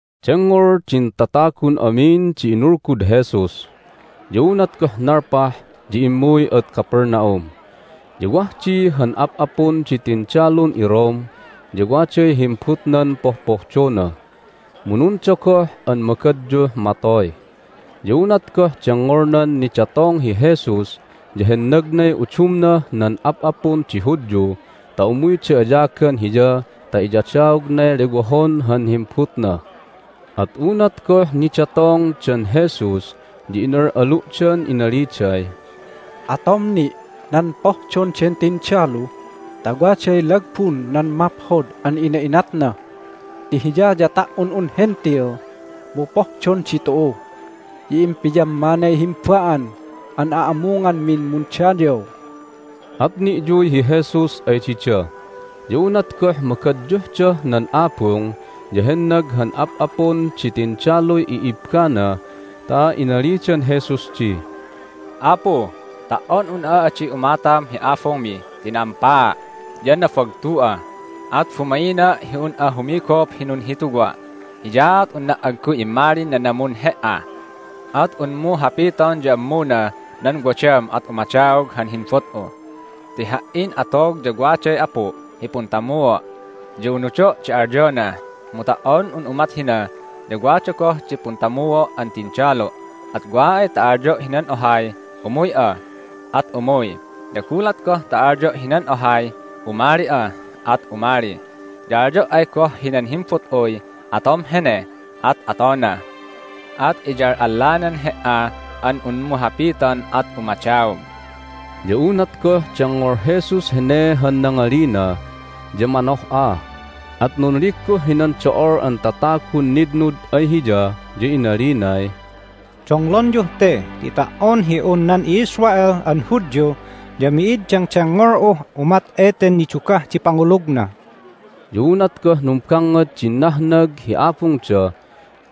Dengngol din tatagun amin di inulgud Jesus. Ya unat goh nalpah ya immuy ad Capernaum. Ya wah di han ap'apun di tindalun iRome, ya waday himbutnan pohpohdona, mu nundogoh an magadyuh matoy. Ya unat goh dengngolnan nidatong hi Jesus ya hennagnay udumnah nan ap'apun di Hudyu ta umuyda ayagan Hiya ta iyadaognay lewohon han himbutna. At unat goh nidatongdan Jesus ya inal'alu'dan inaliday, "Atom ni' nan pohdon den tindalu ta waday lagbun nan maphod an ina'inatna ti hiya ya ta"on un Hentil mu pohdon ditu'u, ya impiyammanay himba'an an a'amunganmin mundayaw." At ni'yuy hi Jesus ay dida. Ya unat goh magadyuhdah nan abung ya hennag han ap'apun di tindaluy i'ibbana ta inalidan Jesus di, "Apu, ta"on un'a adi umatam hi abungmi ti na'ampaa', ya nabagtu'a, at bumaina' hi un'a humigup hi nunhituwa'. Hiyaat unna' agguy immalin nanamun He"a. At unmu hapiton ya ammunah nan wadam at umadaog han himbut'u. Ti ha"in atog ya waday apu' hi puntamua', ya unudo' di alyona. Mu ta"on un umat hina ya wada goh di puntamuo' an tindalu, at wa ay ta alyo' hinan ohay, Umuy'a! at umuy, ya gulat goh ta alyo' hinan ohay, Umali'a! at umali. Ya alyo' ay goh hinan himbut'uy, Atom hene! at atona. At iyal'allanan He"a an unmu hapiton at umadaog." Ya unat goh dengngol Jesus hene han nangalina ya manoh'a, at nunligguh hinan do'ol an tatagun nitnud ay Hiya, ya inalinay, "Donglonyuh te ti ta"on hi un nan i'Israel an Hudyu ya mi'id dengdengngol'uh umat eten nidugah di pangulugna!" Ya unat goh numbangngad din nahnag hi abungda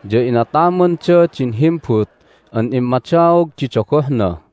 ya inatamanda din himbut an immadaog di dogohna.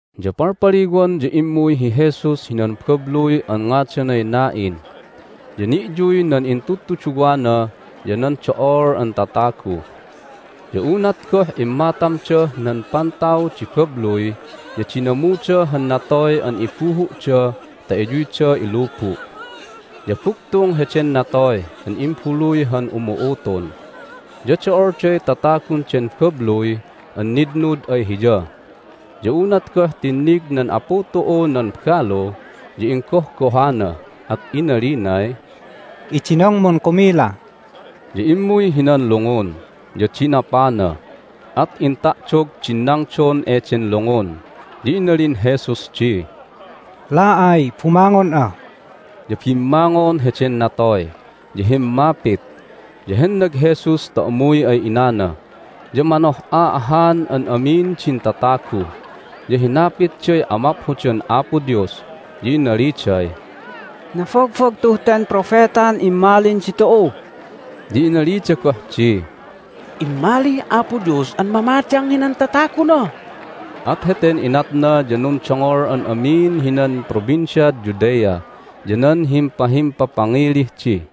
Ya palpaliwan ya immuy hi Jesus hinan babluy an ngadanay Nain, ya ni'yuy nan intudtuduwana ya nan do'ol an tatagu. Ya unat goh immatamdah nan pantaw di babluy ya dinamuda han natoy an ibuhu'da ta iyuyda ilubu'. Ya bugtung heden natoy an imbaluy han umu'utun, ya do'olday tatagun den babluy an nitnud ay hiya. Ya unat goh tinnig nan Apu tu'u nan balu ya inggohgohana, at inalinay, "Idinongmun kumila." Ya immuy hinan lungun, ya dinapana, at inta'dog din nangdon eden lungun. Ya inalin Jesus di, "La'ay, bumangon'a!" Ya bimmangon heden natoy, ya himmapit, ya hennag Jesus ta umuy ay inana. Ya manoh'a ahan an amin din tatagu, ya hinapitday amaphodan Apo Dios, ya inaliday, "Nabagbagtuh ten propetan immalin ditu'u!" Ya inalida goh di, "Immalih Apo Dios an mamadang hinan tataguna!" At heten inatna ya nundongol an amin hinan Provinciad Judea ya nan himpahimpapangilih di.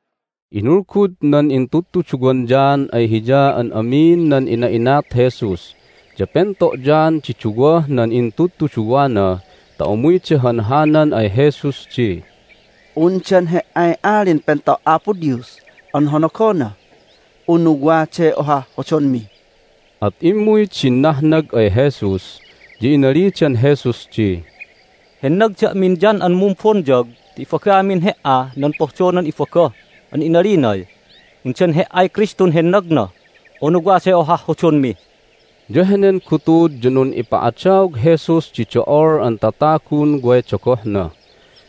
Inulgud nan intudtuduwan John ay hiya an amin nan ina'inat Jesus. Ya pento' John di duwah nan intudtuduwana ta umuyda hanhanan ay Jesus di, "Undan He"ay Alin Pento' Apo Dios an honogona, unu waday ohah hodonmi?" At immuy din nahnag ay Jesus, ya inalidan Jesus di, "Hennag da'min John an Mumbonyag ta ibagamin He"a nan pohdonan ibaga, an inalinay, Undan He"ay Kristun hennagna, unu waday ohah hodonmi?" Ya henen gutud ya nun'ipa'adaog Jesus di do'ol an tatagun way dogohna,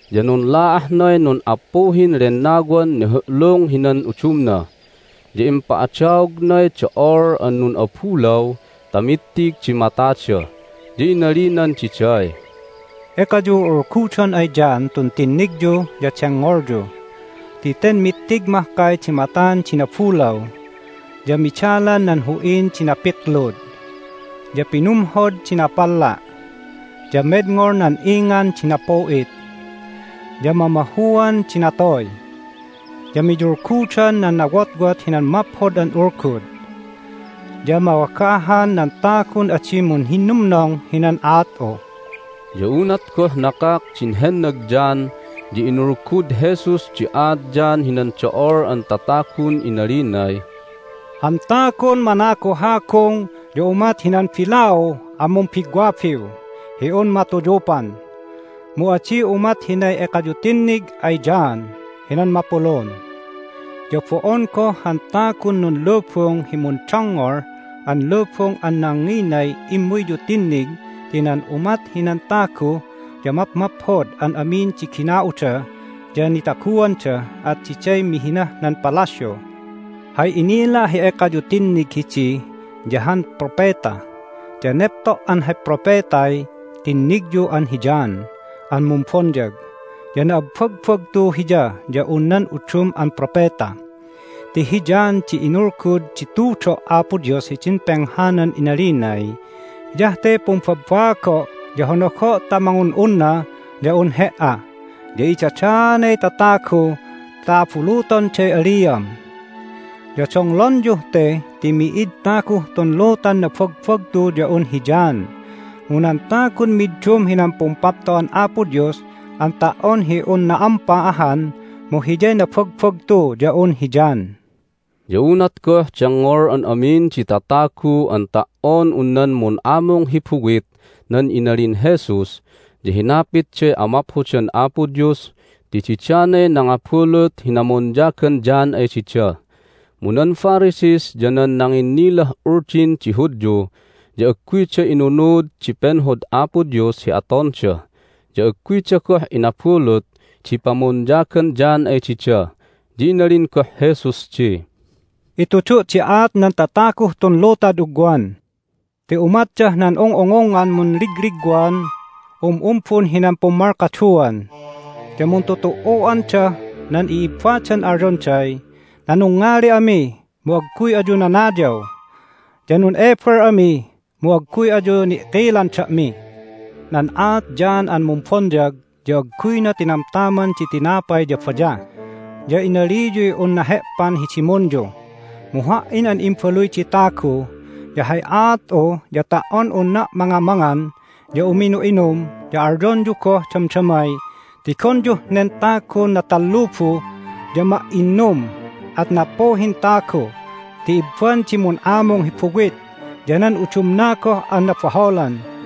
ya nunla'ahnay nun'appuhin lennawan nihu'lung hinan udumna, ya impa'adaognay do'ol an nun'abulaw ta mittig di matada. Ya inalinan diday, "Ekayu ul'ulgudon ay John tun tinnigyu ya dengngolyu. Ti ten mittig mahkay di matan di nabulaw, ya midalan nan hu'in di napiklud, ya pinumhod di napalla', ya medngol nan ingan di napu'it, ya mamahuan di natoy, ya miyulgudan nan nawotwot hinan Maphod an Ulgud. Ya mawagahan nan tagun adi munhinnumnong hinan aat'u!" Ya unat goh nakak din hennag John ya inulgud Jesus di aat John hinan do'ol an tatagun inalinay, "Han tagun managuhagung ya umat hinan bilau an mumbigwabiw hi un matuyupan, mu adi umat hinay ekayu tinnig ay John hinan mapulun. Ya bo'on goh han tagun nunlubung hi mundongngol an lubung an nanginay immuyyu tinnig ti nan umat hinan tagu ya mapmaphod an amin di gina'uda ya nitaguanda, at diday mihinah nan palasyu! Hay inila' hi ekayu tinnig hidi ya han propeta. Ya nepto' an hay propetay tinnigyu an hi John an Mumbonyag, ya na'abbagbagtu hiya ya un nan udum an propeta. Ti hi John di inulgud di tudo' Apo Dios hidin penghanan inalinay, Hiyah te pumbabaago', ya honogo' ta mangun'unna ya un He"a, ya idadaanay tatagu ta abulutonday aliam. Ya donglonyuh te ti mi'id taguh tun lutan nabagbagtu ya un hi John. Mu nan tagun middum hinan Pumpapto'an Apo Dios an ta"on hi un na'ampa ahan mu hiyay nabagbagtu ya un hi John." Ya unat goh dengngol an amin di tatagu an ta"on un nan mun'amung hi buwit nan inalin Jesus ya hinapitday amaphodan Apo Dios ti didanay nangabulut hi namonyagan John ay dida. Mu nan Pharisees ya nan nanginnilah Uldin di Hudyu ya agguyda inunud di penhod Apo Dios hi atonda, ya agguyda goh inabulut di pamonyagan John ay dida. Ya inalin goh Jesus di, "Itudu' di aat nan tataguh tun lutad ugwan ti umatdah nan ung'ungungngan munligligwan um'umbun hinan pummalkaduan, ya muntutu"u'andah nan i'ibbadan alyonday, Nanungngali ami, mu agguy ayu nanayaw. Ya nun'ebel ami, mu agguy ayu ni'kilan da'mi. Nan aat John an Mumbonyag ya agguyna tinamtaman di tinapay ya bayah, ya inaliyuy un nahe'pan hi dimunyu. Mu Ha"in an Imbaluy di Tagu ya hay aat'u ya ta"on unna' mangamangan ya uminu'inum ya alyonyu goh damdamay, Tigonyuh nen tagun natallubu ya ma'innum, at nappuhin tagu ti ibban di mun'amung hi buwit ya nan udumna goh an nabaholan!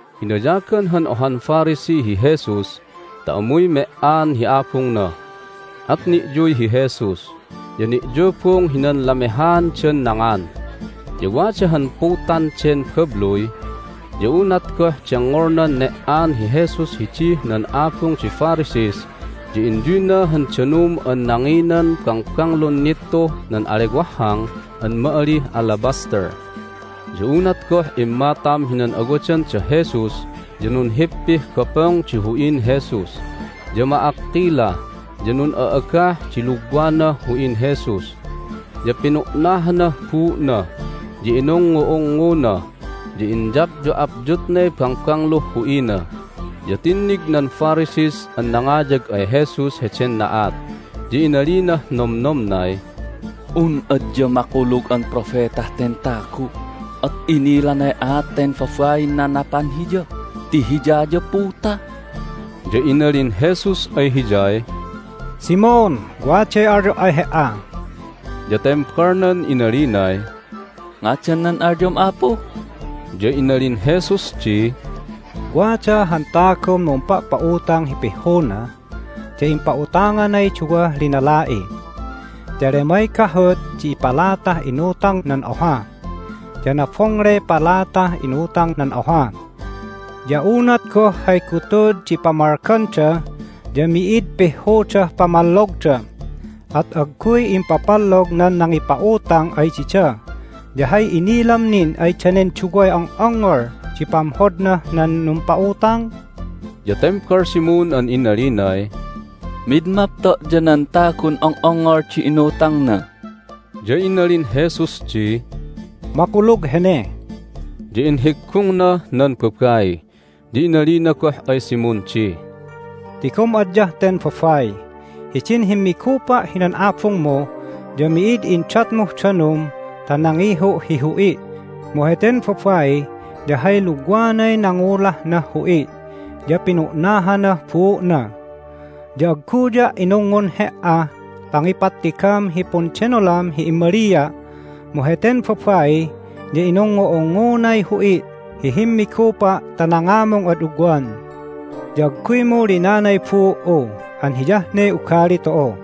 Inayagan han ohan Pharisee hi Jesus ta umuy me"an hi abungna, at ni'yuy hi Jesus, ya ni'yubung hinan lamehaandan nangan. Ya wada han putan den babluy. Ya unat goh dengngolnan ne"an hi Jesus hidih nan abung di Pharisees ya inyuyna han danum an nanginan bangbanglun nittuh nan alewahhang an ma'alih alabaster. Ya unat goh immatam hinan awadan da Jesus ya nunhippih gopong di hu'in Jesus, ya ma'akkila, ya nun'a'agah di lugwanah hu'in Jesus. Ya pinu'nahanah buu'na, ya inungngu'ungnguna, ya inyapyu'apyutnay bangbangluh hu'ina. Ya tinnig nan Pharisees an nangayag ay Jesus heden na'at, ya inalinah nomnomnay, "Un adya makulug an propetah ten tagu at inilanay aat ten babain nanapan Hiya ti hiya ya puta!" Ya inalin Jesus ay hiyay, "Simon, waday alyo' ay he"a." Ya tembalnan inalinay, "Ngadan nan alyom, Apu?" Ya inalin Jesus di, "Wada han tagun mumpa'pa'utang hi pihhuna, ya impa'utanganay duwah linala'i. Ya lemay gahut di palatah inutangnah nan oha, ya nabongley palatah inutangnah nan oha. Ya unat goh hay gutud di pamalganda ya mi'id pihhudah pamallogda, at agguy impapallog nan nangipa'utang ay dida. Ya hay inilam nin ay danen duway ong'ongngol di pamhodnah nan numpa'utang?" Ya tembal Simon an inalinay, "Mid mapto' ya nan tagun ong'ongngol di inutangna." Ya inalin Jesus di, "Makulug hene." Ya inhiggungnah nan babai, ya inalina goh ay Simon di, "Tigom adyah ten babai. Hidin himmigupa' hinan abungmu ya mi'id indatmuh danum ta nangihu' hi hu'i', mu heten babai ya hay lugwanay nangulahnah hu'i', ya pinu'nahanah buu'na. Ya agguya' inungngun he"ah pangipattigam hi pundenolam hi immalia', mu heten babai ya inungngu'ungngunay hu'i' hi himmigupa' ta nangamung ad ugwan. Ya agguymu linanay buu"u an hiyah ne ugali tu'u,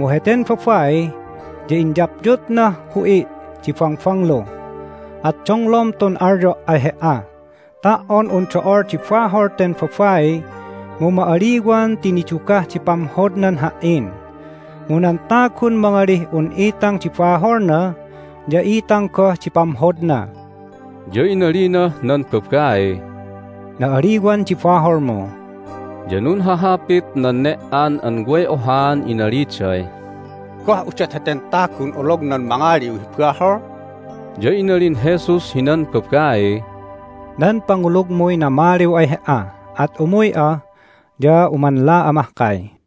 mu heten babai ya inyapyutnah hu'i' di bangbanglu. At donglom tun alyo' ay he"a: ta"on un do'ol di bahol ten babai mu ma'aliwan ti nidugah di pamhodnan Ha"in, mu nan tagun mangalih un itang di baholna ya itang goh di pamhodna." Ya inalinah nan babaiy, "Na'aliwan di baholmu." Ya nunhahapit nan ne"an an way ohaan inaliday, "Goh udot heten tagun olognan mangaliw hi bahol?" Ya inalin Jesus hinan babaiy, "Nan pangulugmuy namaliw ay he"a. At umuy'a, ya umanla'a mahkay."